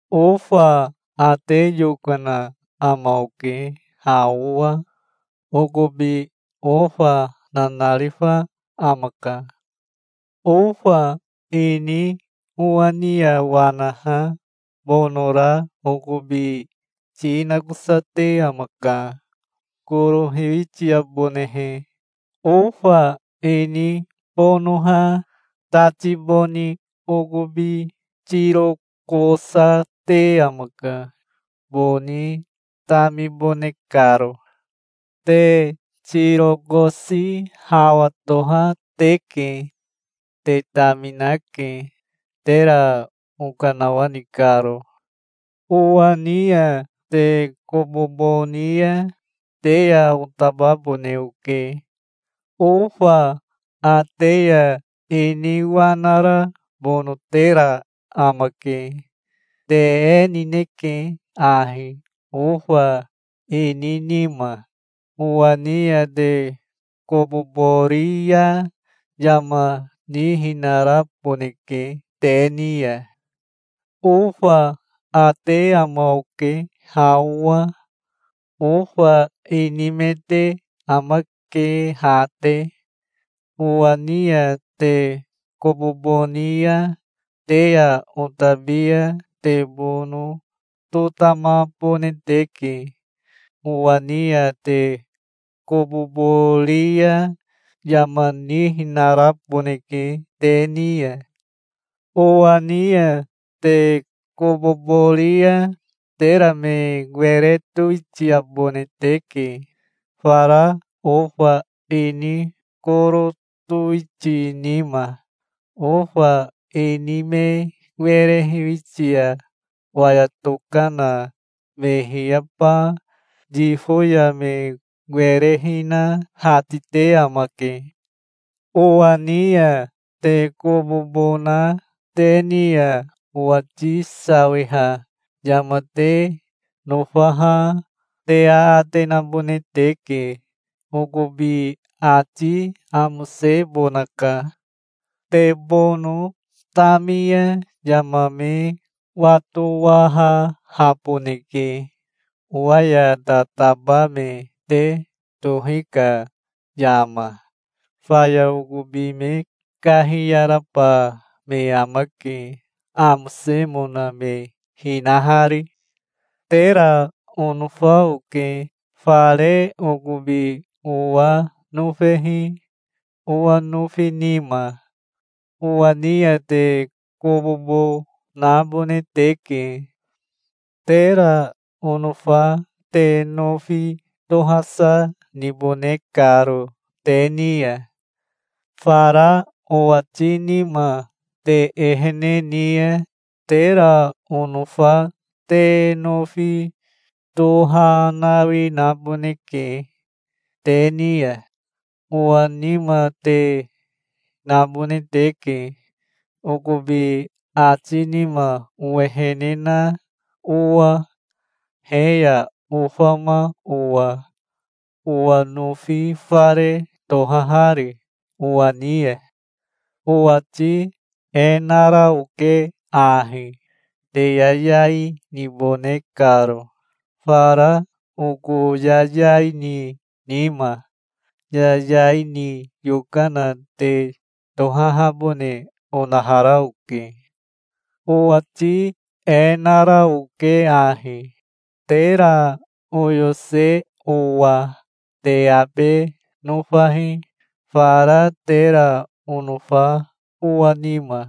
"Ofa ate yokana ama oke, ha owa. Okobi ofa nanarifa amaka. Ofa ini owa ni ya wanaha bonora okobi ti nakosate amaka, koro hiwitiabonehe. Ofa ini bonoha tati boni okobi tirokosate amaka, boni tamibone karo. Te tirokosi hawa toha teke. Te taminake, tera okanawani karo. Owa ni ya te kobobo ni ya te ya otababone oke. Ofa ate ya ini wanara bonotera amake. Te e nineke ahi, ofa ini nima. Owa ni ya te kobobo ri ya yama nihinaraboneke te ni ya". "Ofa ate ama oke ha owa. Ofa ini me te amake ha te. Owa ni ya te kobobo ni ya te ya otabi ya te bono totamabone teke. Owa ni ya te kobobo ri ya yama nihinaraboneke te ni ya. Owa ni ya te kobobo ri ya tera me were towitiabone teke, fara ofa ini koro towiti nima. Ofa ini me were hiwitia waya tokana me hiyaba yifo ya me were hina hatite amake. Owa ni ya te kobobo na te ni ya owati sawiha yama te nofaha te aate nabone teke. Okobi ati amosebonaka. Te bono tami ya yama me watowahahaboneke, owa ya tataba me te tohi ka yama. Faya okobi me kahiyaraba me amake, amosemona me hinahari. Tera onofa oke, fare okobi owa nofehi owa nofi nima. Owa ni ya te kobobo nabone teke, tera onofa te nofi tohasa nibone karo te ni ya. Fara owati nima te ehene ni ya tera onofa te nofi tohanawi naboneke te ni ya. Owa nima te nabone teke, okobi ati nima owehene na owa, he ya ofama owa, owa nofi fare tohahari owa ni ya". "Owati e nara oke ahi, te yayai nibone karo, fara oko yayai ni nima. Yayai ni yokana te tohahabone onahara oke. Owati e nara oke ahi, tera oyose owa: Te abe nofahi, fara tera onofa owa nima.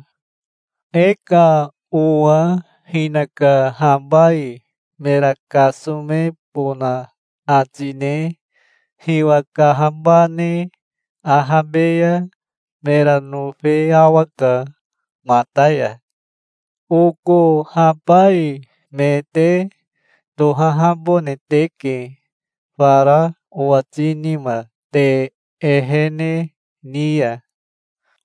E ka owa hinaka habai mera kasomebona ati ne hiwa kahabane ahabe ya mera nofe awaka mata ya. Oko habai me te tohahabone teke, fara owati nima te ehene ni ya.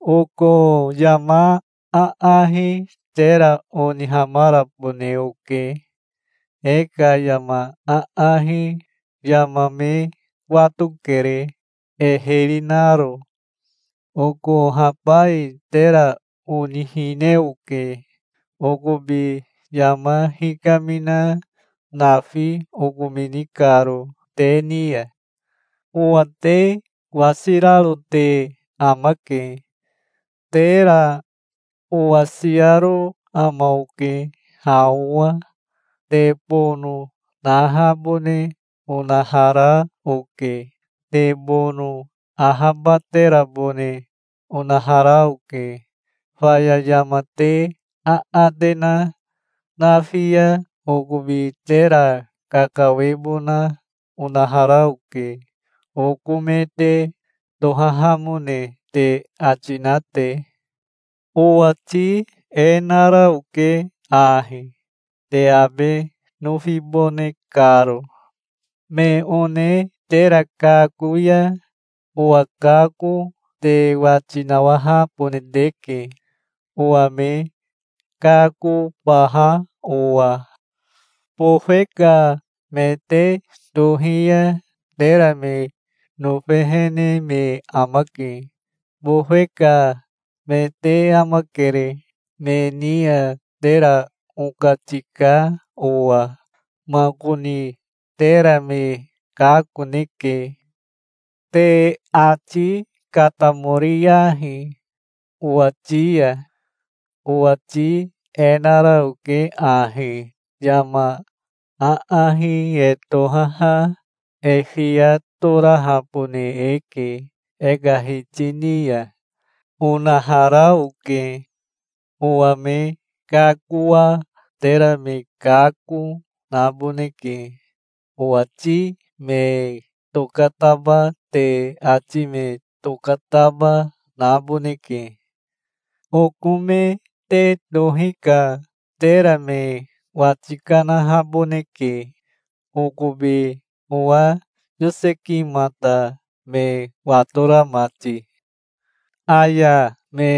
Oko yama aahi tera onihamarabone oke. E ka yama aahi yama me watokere e hiri naro. Oko habai tera onihine oke, okobi yama hikamina nafi okomini karo te ni ya. Owa te wasiraro te amake. Tera owasiaro ama oke ha owa. Te bono nahabone onahara oke. Te bono ahabaterabone onahara oke. Faya yama te aate na nafi ya okobi tera kakawebona onahara oke, oko me te tohahamone te ati na te. Owati e nara oke ahi, te abe nofibone karo". "Me one tera kako ya owa kako te wati nawahabone teke, owa me kakobaha owa. Bofe ka me te tohi ya tera me nofehene me amake. Bofe ka me te amakere, me ni ya tera okatika owa. Makoni tera me kakoneke. Te ati katamoriyahi owati ya. Owati e nara oke ahi: 'Yama aahi e tohaha e fiya torahabone eke e ka hiti ni ya', onahara oke. Owa me kakoa tera me kako naboneke. Owati me tokataba te ati me tokataba, naboneke. Oko me te tohi ka tera me wati kanahaboneke, okobi owa yosekimata me watora mati. Aya me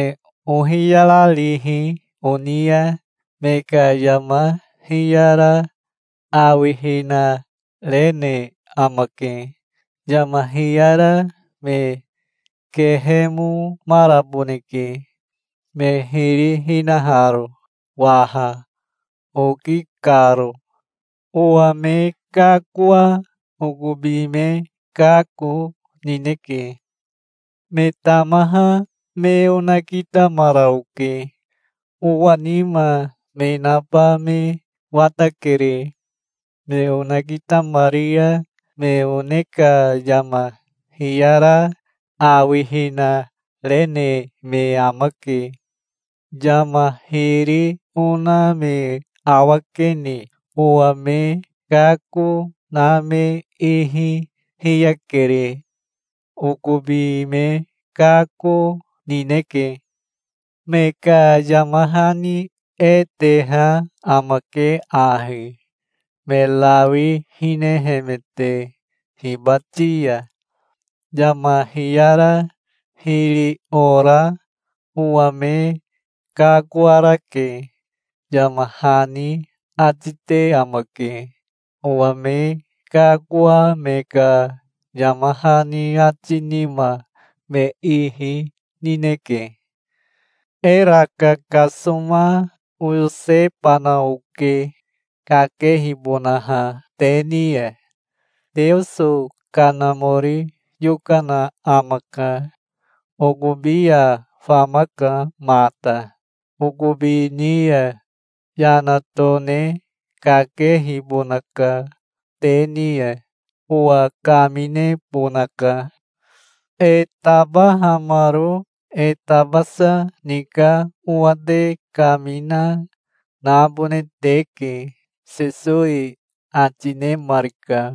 ohiyararihi oni ya me ka yama hiyara awihina rene amake. Yama hiyara me kehemomaraboneke, me hiri hinaharo waha, oki karo. Owa me kakoa okobi me kako nineke. Me tamaha me onakitamara oke. Owa nima me naba me watakere. Me onakitamari ya me one ka yama hiyara awihina rene me amake. Yama hiri ona me awakene owa me kako na me ihi hiyakere. Okobi me kako nineke. Me ka yama hani e teha amake ahi, me rawi hinehemete hibati ya: 'Yama hiyara hiri ora owa me kakoarake', yama hani ati te amake. Owa me kakoa me ka yama hani ati nima me ihi nineke". "Era kakasoma oyosebana oke, kakehibonaha te ni ya. Teoso Kanamori yokana amaka. Okobi ya famaka mata. Okobi ni ya yana tone kakehibonaka te ni ya. Owa kaminebonaka. E tabahamaro e tabasa ni ka owa te kamina, nabone teke", Sesowi ati nemarika.